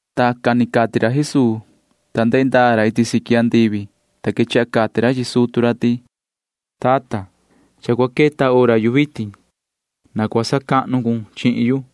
Tacan ni cati ra Jesuu, ta ndehe ndaa ra iti siqui andivi, ta quechaha cati ra chi sutu ra ti: ―Tata, cha cua queta hora yu vitin. Na cua sacahnu cun chihin yu,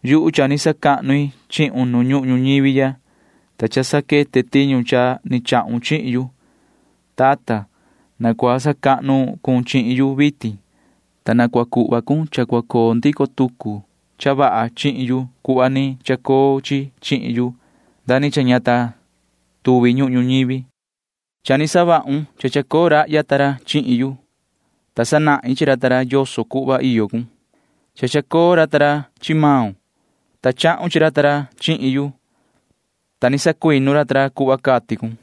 ’Yuhu cha ni sacahnu i chihun ihya nu ñuhun ñuñivi ya, ta cha saquete tiñu cha ni chahun chihin yu. Tata, na cua sacahnu cun chihin yu vitin, ta na cua cuhva cun cha cua coo ndico tucu cha vaha chihin yu cuhva ni chacoo chi chihin yu, ta ña ta tuvi ñuhun ñuñivi ya. ’Cha ni savahun cha chacoo rahya ta ra chihin yu, ta sanahin chi ra yoso cuhva iyo cun. Cha chacoo ra chi maun, ta savahun cha cua coo ra chihin yu, ta ni sacuinu ra cuhva cati cun.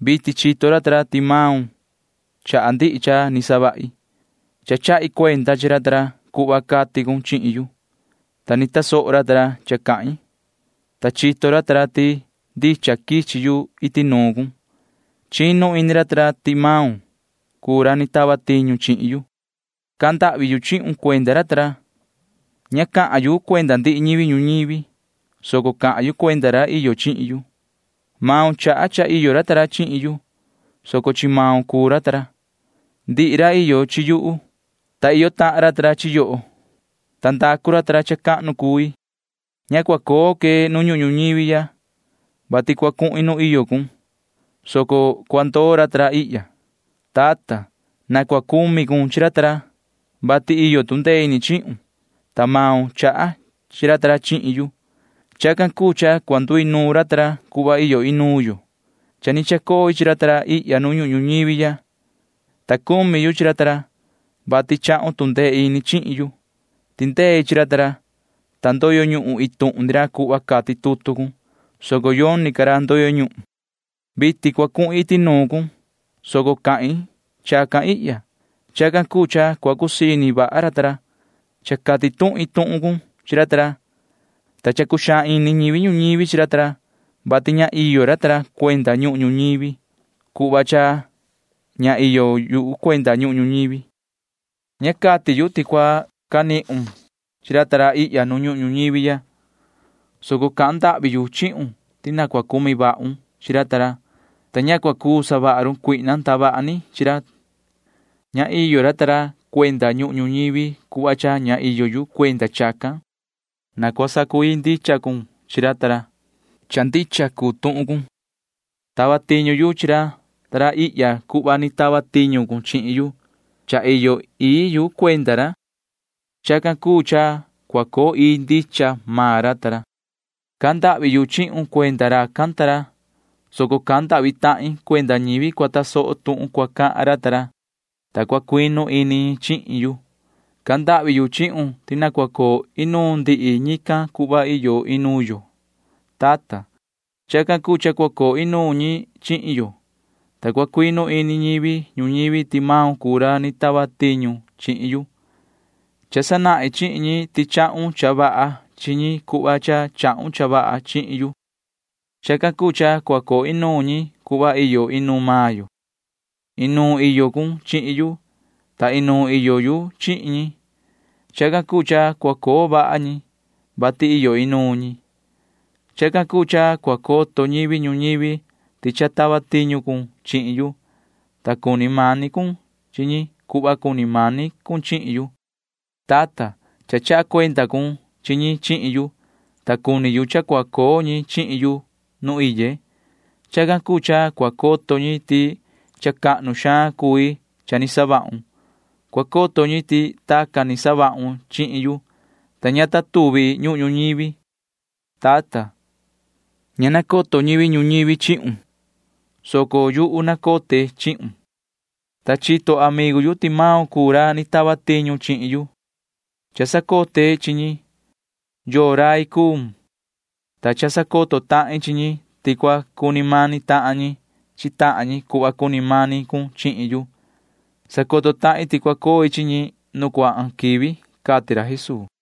Vitin chito ra ti maun chaha ndihi cha ni savahi. Cha chahi cuenda chi ra cuhva cati cun chihin yu, ta cha ni tasoho ra cha cahin, ta chito ra ti ndicha quichi yu iti nuun cun. Chinu ini ra ti maun cuu ra ni tava tiñu chihin yu. ’Cahan ndahvi yu chihun cuenda ra. Ña cahan yu cuenda ndihi ñivi ñuñivi, soco cahan yu cuenda ra iyo chihin yu. Maun chaha cha iyo ra chihin yu, soco chi maun cuu ra. Ndihi ra iyo chi yuhu, ta iyo tahan ra chi yoho, ta cha ndacu ra cha cahnu cui. ’Ña cua coo que nu ñuhun ñuñivi ya, vati cua cuhin nu iyo cun, soco cua ndoo maan ra ihya. Tata, na cua cumi cun chi ra, vati iyo tu ndee ini chihun, ta maun chaha chi ra chihin yu. Chacan cuu cha cua nduinuun ra cuhva iyo inuun yo. Cha ni chacoi chi ra ihya nu ñuhun ñuñivi ya, ta chacucumi yu chi ra, vati chahun tu ndee ini chihin yu. Cha tindei chi ra, ta iin tuhun ni ra ndoyo ñuhun cuhva cati tutu cun, soco yoni ca ra ndoyo ñuhun. ’Vitin cua cuhin iti nuun cun, soco cahin chacan ihya. Chacan cuu cha cua cusii ini vaha ra ta ra. Cha cati tuhin tuhun cun chi ra, ta cha cuxaan ini ñivi ñuñivi chi ra, vati ña iyo ra cuenda ñuhun ñuñivi cuhva cha ña iyo yu cuenda ñuhun ñuñivi. Ña cati yu ti cua canihun chi ra ihya nu ñuhun ñuñivi ya, soco cahan ndahvi yu chihun ti na cua cucumi vahun chi ra, ta ña cua cuu savaha run cuihna ndavaha ni chi ra. Ña iyo ra cuenda ñuhun ñuñivi cuhva cha ña iyo yu cuenda chacan. Na cua sacu‑ii ndicha cun chi ra. Cha ndicha cuu tuhun cun. Tava tiñu yu chi ra ihya cuhva ni tava tiñu cun chihin yu ihya. Cha iyo ii yu cuenda ra. Chacan cuu cha cua coo ii ndicha maan ra. ’Cahan ndahvi yu chihun cuenda racan ta ra, soco cahan ndahvi tahin cuenda ñivi cua tasoho tuhun cua cahan ra, ta cua cuinu ini ñi chihin yu. Cahan ndahvi yu chihun ti na cua coo inuun ndihi ñican cuhva iyo inuun yo, tata. Chacan cuu cha cua coo inuun ñi chihin yo, ta cua cuinu ini ñivi ñuñivi ti maun cuu ra ni tava tiñu chihin yu. Cha sanahin chi ñi ti chahun cha vaha chi ñi cuhva cha chahun cha vaha chihin yu. Chacan cuu cha cua coo inuun ñi cuhva iyo inuun maan yo. Inuun iyo cun chihin yu, ta inuun iyo yu chi ñi. Chacan cuu cha cua coo vaha ñi, vati iyo inuun ñi. Chacan cuu cha cua coto ñivi ñuñivi ti cha tava tiñu cun chihin yu, ta cuni mani cun chi ñi cuhva cuni mani cun chihin yu. ’Tata, cha chaha cuenda cun chi ñi chihin yu, ta cuni yu cha cua coo ñi chihin yu nu iye. Chacan cuu cha cua coto ñi ti cha cahnu xaan cui cha ni savahun. Cua coto ñi ti tacan ni savahun chihin yu, ta ña ta tuvi ñuhun ñuñivi. Tata, ña nacoto ñivi ñuñivi chihun, soco yuhu nacote chihun, ta chito amigu yu ti maun cuu ra ni tava tiñu chihin yu. Cha sacote chi ñi yoo rai cuun, ta cha sacoto tahin chi ñi ti cua cuni mani tahan ñi chi tahan ñi cuhva cuni mani cun chihin yu. Sacoto tahin ti cua coi chi ñi nu cuahan quivi ―cati ra Jesuu.